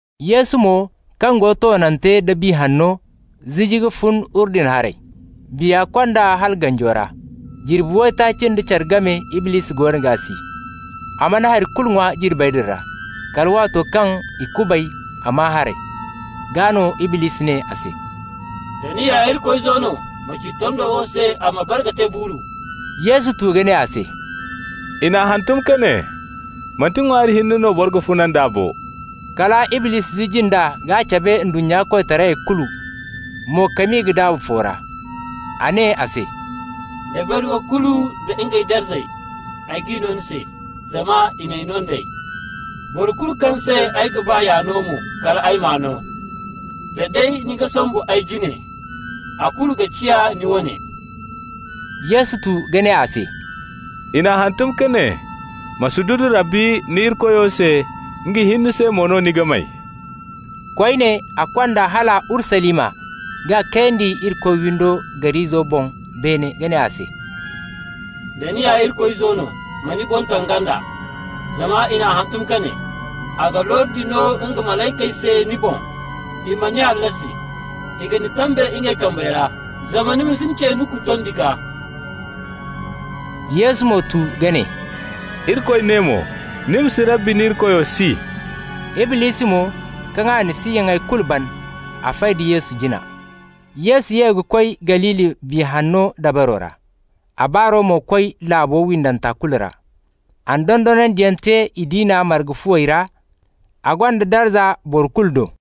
Yesu mo, kaŋ go toonante da Biya Hanno ziji ka fun Urdun haray. Biya kond'a hala ganjo ra. Jirbi waytaaci nda care game Iblisi goono g'a si. A mana hay kulu ŋwa jirbey din ra, kala waato kaŋ i kubay, a maa haray. Gaa no Iblisi ne a se: «Da ni ya Irikoy Izo no, ma ci tondo wo se a ma bare ka te buuru.» Yesu tu ka ne a se: «I n'a hantum ka ne: ‹Manti ŋwaari hinne no boro ga funa nd'a bo.›» Kala Iblisi ziji nd'a k'a cabe ndunnya koytarayey kulu, mo-ka-mi ka daabu fo ra. A ne a se: «Dabari wo kulu nda ngey darza, ay g'i no ni se, zama i n'ay no nd'ey. Boro kulu kaŋ se ay ga ba y'a no mo, kal ay m'a no. Da day ni ga sombu ay jine, a kulu ga ciya ni wane.» Yesu tu ka ne a se: «I n'a hantum ka ne: ‹Ma sududu Rabbi ni Irikoyo se, nga hinne se mo no ni ga may.›» Koyne, a kond'a hala Urusalima k'a kayandi Irikoy windo gar'izo boŋ beene ka ne a se: «Da ni ya Irikoy Izo no, ma ni boŋ taŋ ganda. Zama i n'a hantum ka ne: ‹A ga lordi no nga malaykey se ni boŋ, i ma ni hallasi. I ga ni tambe ngey kambey ra, zama ni ma si ni ce nuku tondi gaa.›» Yesu mo tu ka ne: «Irikoy ne mo: ‹Ni ma si Rabbi ni Irikoyo si.›» Iblisi mo, kaŋ a na siyaŋey kulu ban, a fay da Yesu jina. Yesu ye ka koy Galili Biya Hanna dabaro ra. A baaro mo koy laabo windanta kulu ra. A na dondonandiyaŋ te i diina marga fuwey ra, a gonda darza boro kulu do.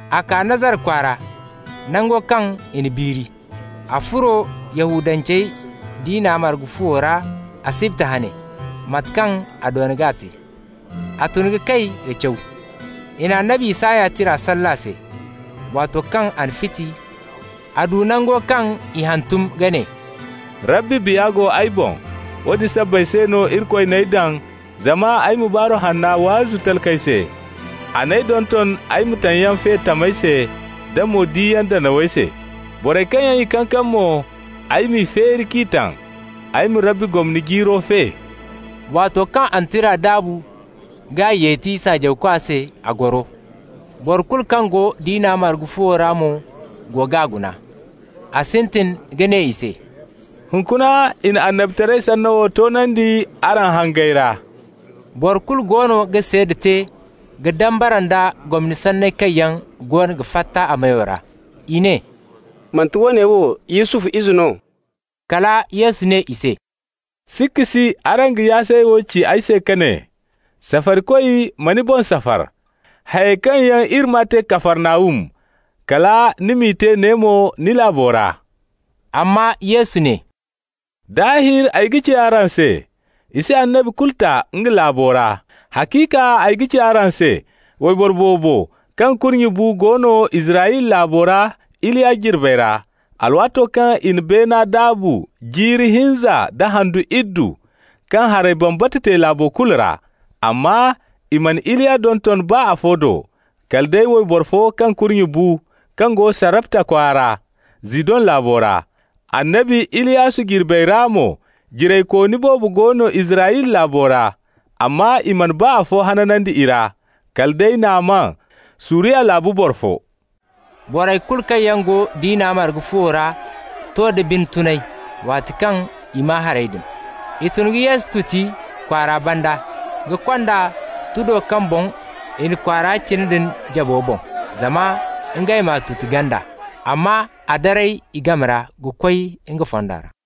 A kaa Nazara kwaara, nango kaŋ i n'a biiri. A furo Yahudance diina marga fuwo ra asibti hane, mate kaŋ a doona ka te. A tun ka kay ka caw. I na annabi Isaya tira salle a se. Waato kaŋ a n'a fiti, a du nango kaŋ i hantum ka ne: «Rabbi Biya go ay boŋ. Woodin sabbay se no Irikoy n'ay daŋ zama ay ma baaru hanna waazu talkey se, ay n'ay donton ay ma taŋyaŋ fe tamey se, da mo-diyaŋ danawey se. Borey kaŋ yaŋ i kankam mo, ay m'i feeri k'i taŋ, ay ma Rabbi gomni jiiro fe.» Waato kaŋ a na tira daabu k'a yeti saajawkwa se, a goro. Boro kulu kaŋ go diina marga fuwo ra mo go g'a guna. A sintin ka ne i se: «Hunkuna i na annabitaray sanno wo toonandi araŋ hangey ra.» Boro kulu goono ga seeda te ka dambara nda gomni sanney kaŋ yaŋ goono ga fatta a meyo ra. I ne: «Manti woone wo Yusufu ize no?» Kala Yesu ne i se: «Sikka si araŋ ga yaasay wo ci ay se ka ne: ‹Safarikoy, ma ni boŋ safar.› Hayey kaŋ yaŋ iri maa te Kafarnahum, kala ni m'i te ne mo, ni laabo ra.» Amma Yesu ne: «Daahir ay ga ci araŋ se: i si annabi kulu ta nga laabo ra. Haciika ay ga ci araŋ se: wayboro boobo kaŋ kurnye bu go no Israyla laabo ra Iliya jirbey ra, alwaato kaŋ i na beena daabu jiiri hinza nda handu iddu, kaŋ haray bambata te laabo kulu ra. Amma i mana Iliya donton baa afo do, kala day wayboro fo kaŋ kurnye bu kaŋ go Sarepta kwaara, Zidon laabo ra. Annabi Iliyasu jirbey ra mo, jiraykooni boobo go no Israyla laabo ra, amma i mana baa afo hanandi i ra, kala day Naaman, Suriya laabu boro fo.» Borey kulu kaŋ yaŋ go diina marga fuwo ra to da bine tunay waato kaŋ i maa hayey din. I tun ka Yesu tuti kwaara banda ka kond'a tudo kaŋ boŋ i na kwaara cina din jabo boŋ, zama ngey m'a tuti ganda. Amma a daray i game ra ka koy nga fonda ra.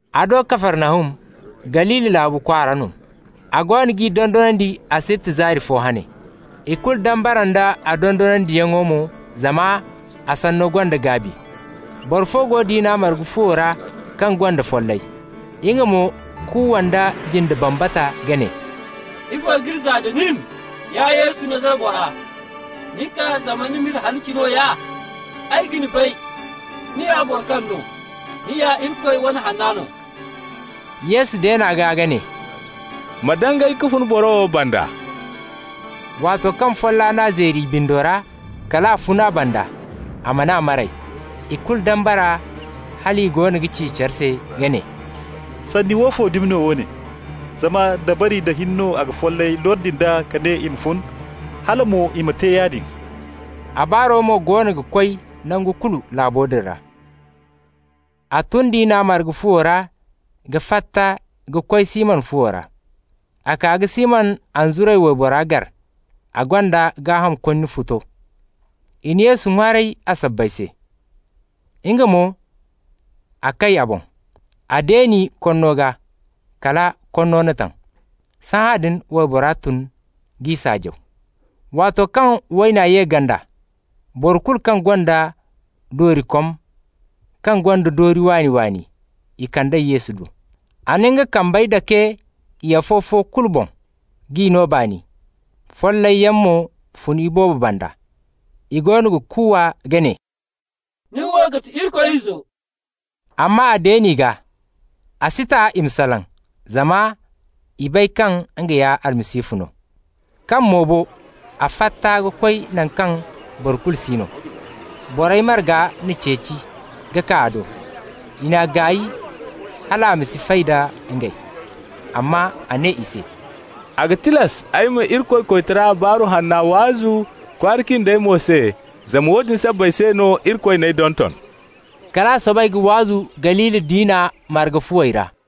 A do Kafarnahum, Galili laabu kwaara no. A goono g'i dondonandi asibti zaari fo hane. I kulu dambara nd'a dondonandiyaŋo mo, zama a sanno gonda gaabi. Boro fo go diina marga fuwo ra kaŋ gonda follay. Nga mo kuuwa nda jinde bambata ka ne: «Ifo k'iri zaa nda nin, ya Yesu, Nazara bora? Ni kaa zama ni m'iri halaci nooya? Ay ga ni bay, ni ya boro kaŋ no! Ni ya Irikoy wane hanna no.» Yesu deen'a gaa ka ne: «Ma dangay ka fun boro wo banda!» Waato kaŋ folla n'a zeeri i bindo ra, kal a fun a banda, a man'a maray. I kulu dambara hal i goono ga ci care se ka ne: «Sanni woofo dumi no woone? Zama dabari nda hin no a ga follayey lordi nd'a ka ne i ma fun, hala mo i ma te yaadin.» A baaro mo goono ga koy nangu kulu laabo din ra. A tun diina marga fuwo ra ka fatta ka koy Siman fuwo ra. A kaa ka Siman anzuray waybora gar, a gonda gaaham konni futo. I na Yesu ŋwaaray a sabbay se. Nga mo, a kay a boŋ. A deeni konno gaa kala konno n'a taŋ. Sahãadin waybora tun k'i saajaw. Waato kaŋ wayna ye ganda, boro kulu kaŋ gonda doorikom kaŋ gonda doori waani-waani, i kand'ey Yesu do. A na nga kambey dake i afo-fo kulu boŋ, k'i no baani. Follayyaŋ mo fun iboobo banda, i goono ga kuuwa ka ne: «Ni wo ga ti Irikoy Izo.» Amma a deen'i gaa. A si ta i ma salaŋ, zama i bay kaŋ nga ya Almasihu no. Kaŋ mo bo, a fatta ka koy naŋ kaŋ boro kulu si no. Borey marga n'a ceeci ka kaa a do. I n'a gaay hal a ma si fay da ngey. Amma a ne i se: «A ga tilas ay ma Irikoy koytara Baaru Hanna waazu kwaara cindey mo se, zama woodin sabbay se no Irikoy n'ay donton.» Kal a soobay ka waazu Galili diina marga fuwey ra.